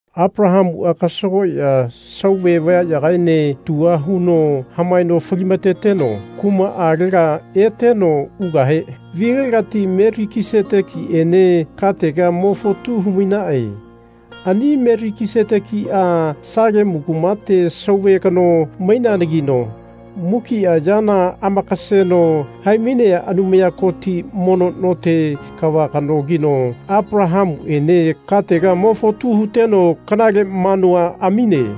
Apalahamua kasagoya sauve vayayagaene tua huno hamaeno falimateteno kumaalega eteno ugahe vilegati Melikisetekiene katega mo fotu humaine. Ani Melikisetekia Salemu kumate sauve kano maineanagino, mukia yana amakaseno hai-mainea Anumaya Koti mono note kava kanogino Apalahamuene katega mo fotu huteno kanale manua amine.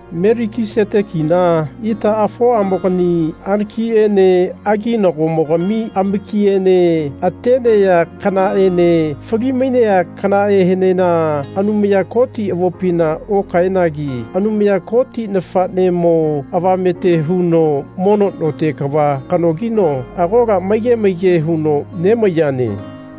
Melikisetekina itaafoamogani anakiene aginagomogami amakiene atenea kanaene fali-mainea kanaheenena Anumaya Koti avopina okaenagi Anumaya Koti nafanemo avamete huno mono note kava kanogino agola maige maige huno nemaiyane.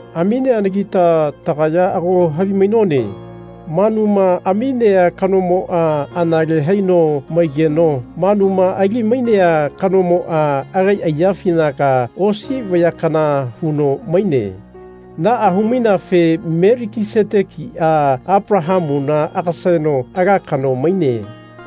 Amineanagita tagaya ago havimainone manuma aminea kanomoa anale haino maigeno manuma ali-mainea kanomoa agai aiyafinaga osi vaya kana huno maine. Naa hu-maineafe Melikisetekia Apalahamuna agaseno ala kano maine.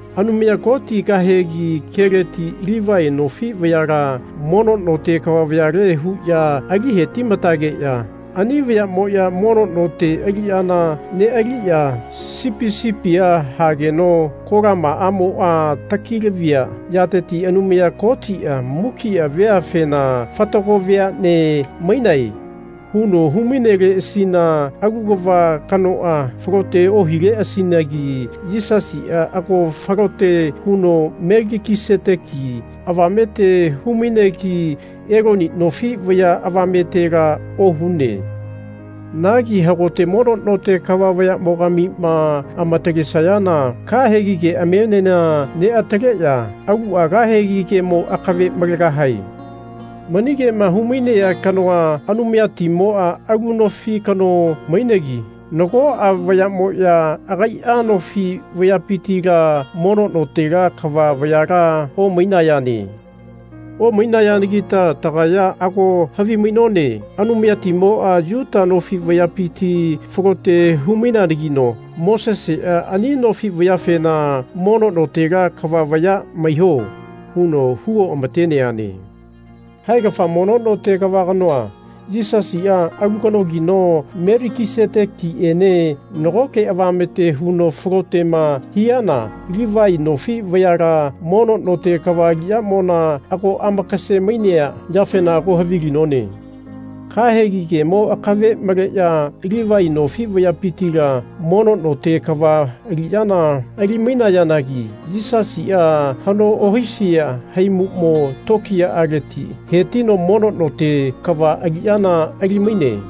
Anumaya Koti kahegi keleti Livai nofi vayala mono note kava vayale huya ali hetimatageya ani vayamoya mono note aliyana nealiya sipi sipia hageno kolamaamoa taki-lavia yateti Anumaya Kotia mukia veafena Fatago veane mainae. huno hu-maineleasina alu kava kanoa falote ohileasinagi Yisasia ago falote huno Melikiseteki avamete hu-mainegi Eloni nofi vaya avametela ohune. Nagi hagote mono note kava vayamogamima amatalesayana kahegi keamienena neataleya alua kahegi kemo akave malegahae. Mani kema humainea kanoa, Anumayatimoa alu nofi kano mainegi nagoa vayamoya agaia nofi vayapitila mono notela kava vayala omainayane. Omainayanagita tagaya ago havimainone Anumayatimoa Yuta nofi vayapiti falote hu-maineanagino Mosesea ani nofi vayafena Mono notela kava vaya maiho. huno hu oamateneane. Haegafa mono note kava kanoa, Yisasia, alu kanogino Melikisetekiene nago avamete huno falotema hiana Livai nofi vayala mono note kava aliyamona ago amakase-mainea yafena ago havilinone. Kahegi kemo akave maleya Livai nofi vayapitila mono note kava aliyana ali-mainayanagi Yisasia hano ohisia haimumo tokiyaleti hetino mono note kava aliyana ali-maine.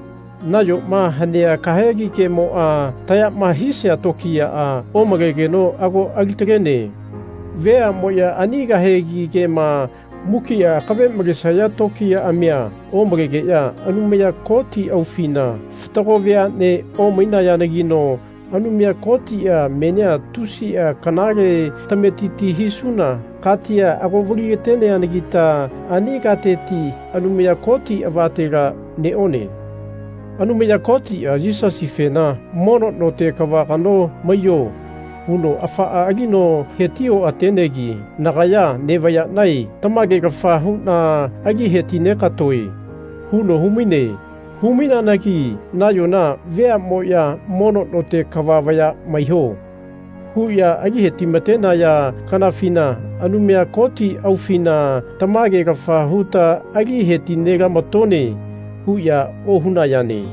Nayoma hanea kahegi kemoa tayama hisia tokiyaa omalegeno ago ali-talene. Veamoya ani kahegi kema mukia akave malesaya tokiyaamia omalegeya Anumaya Koti aufina fatago veanea omainayanagino Anumaya Kotia menia tusia kanale tametiti hisuna katia ago valilateneanagita ani kateti Anumaya Koti avatela neone. Anumaya Kotia Yisasifena Mono note kava kano maiyo. huno afaa alino heti oatenegi Nagaya nevayanae tamagelafa huna ali heti negatoe. huno humaine. Hu-maineanagi nayona veamoya Mono note kava vaya maiho. huya ali hetimatenaya kanafina Anumaya Koti aufina tamagelafa huta ali heti nelamatone. huya ohunayane.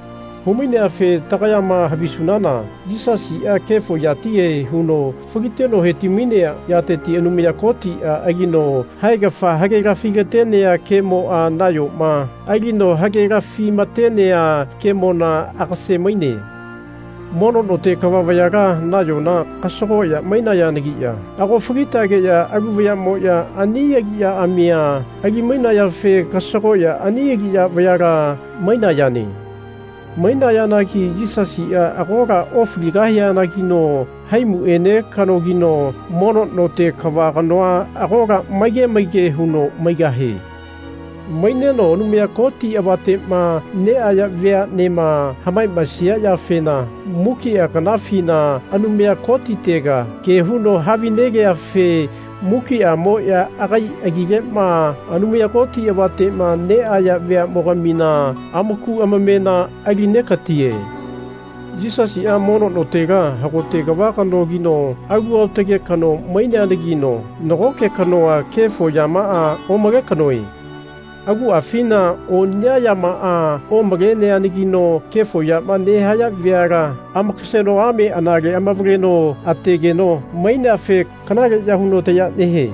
Hu-maineafe tagayama havisunana Yisasia kefo yatihe huno faliteno heti-mainea yateti Anumaya Kotia alino haegafa hagelafi-latenea kemoa nayoma alino hagelafi matenea kemona agase-maine. Mono note kava vayala nayona kasagoya mainayanagiya ago falitageya alu vayamoya ani aliyaamia ali-mainayafe kasagoya ani aliya vayala mainayane. Mainayanagi Yisasia agola ofaligahianagino haimuene kanogino mono note kava kanoa agola maige maige huno maigahie. Maineno Anumaya Koti avatema neaya veanema hamamaesia yafena mukia kanafina Anumaya Kotitega ke huno havinegeafe mukiamoya agai agilema Anumaya Koti avatema neaya veamogamina amaku amamena ali negatie. Yisasia mono notela hagote kava kanogino alu aotage kano maineanagino nagoke kanoa kefo yamaa omale kanoe. Aguafina oniya yamaa omaleneanagino kefo yama nehaya veala amakasegeno ame anale avaleno ategeno maineafe kanaleya huno taya nehie.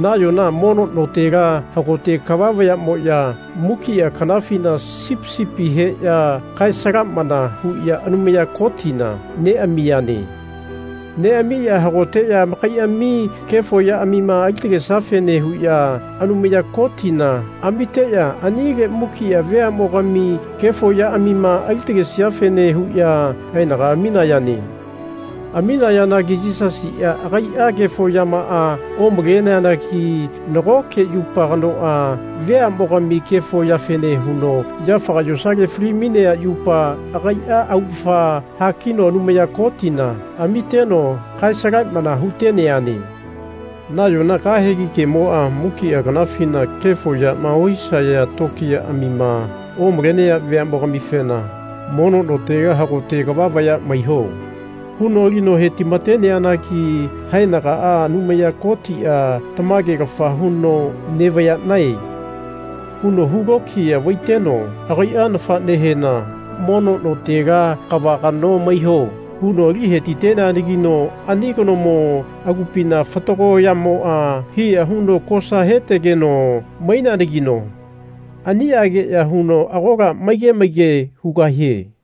Nayona mono notela hagote kava vayamoya mukia kanafina sipi sipi heya kae-salamana huya Anumaya Kotina neamiyane. Neamiya hagoteya amakaiami kefo yaamima ali-talesiafene huya Anumaya Kotina amiteya anile mukia veamogami kefo yaamima ali-taleseafene huya haenaga aminayane. Aminayanagi Yisasia agaia kefo yamaa omaleanagi nagoke yupa kanoa veamogami kefo yafene huno yafaga yosale fali-mainea yupa agaia augafa hakino Anumaya Kotina amiteno kae-salamana huteneane. Nayona kahegi kemoa mukia kanafina kefo yama ohisaya tokiyaamima omalenea veamogamifena Mono notela hagote kava vaya maiho. huno alino hetimateneanagi haenagaa Anumaya Kotia tamagelafa huno Nevayanae. huno hu lokiya vaiteno agaia nafanehena Mono notela kava kano maiyo. huno ali hetiteneanagino ani kanomo agupina fatago yamoa hiya huno kosa hetegeno maineanagino aniageya huno agola maige maige hugahie.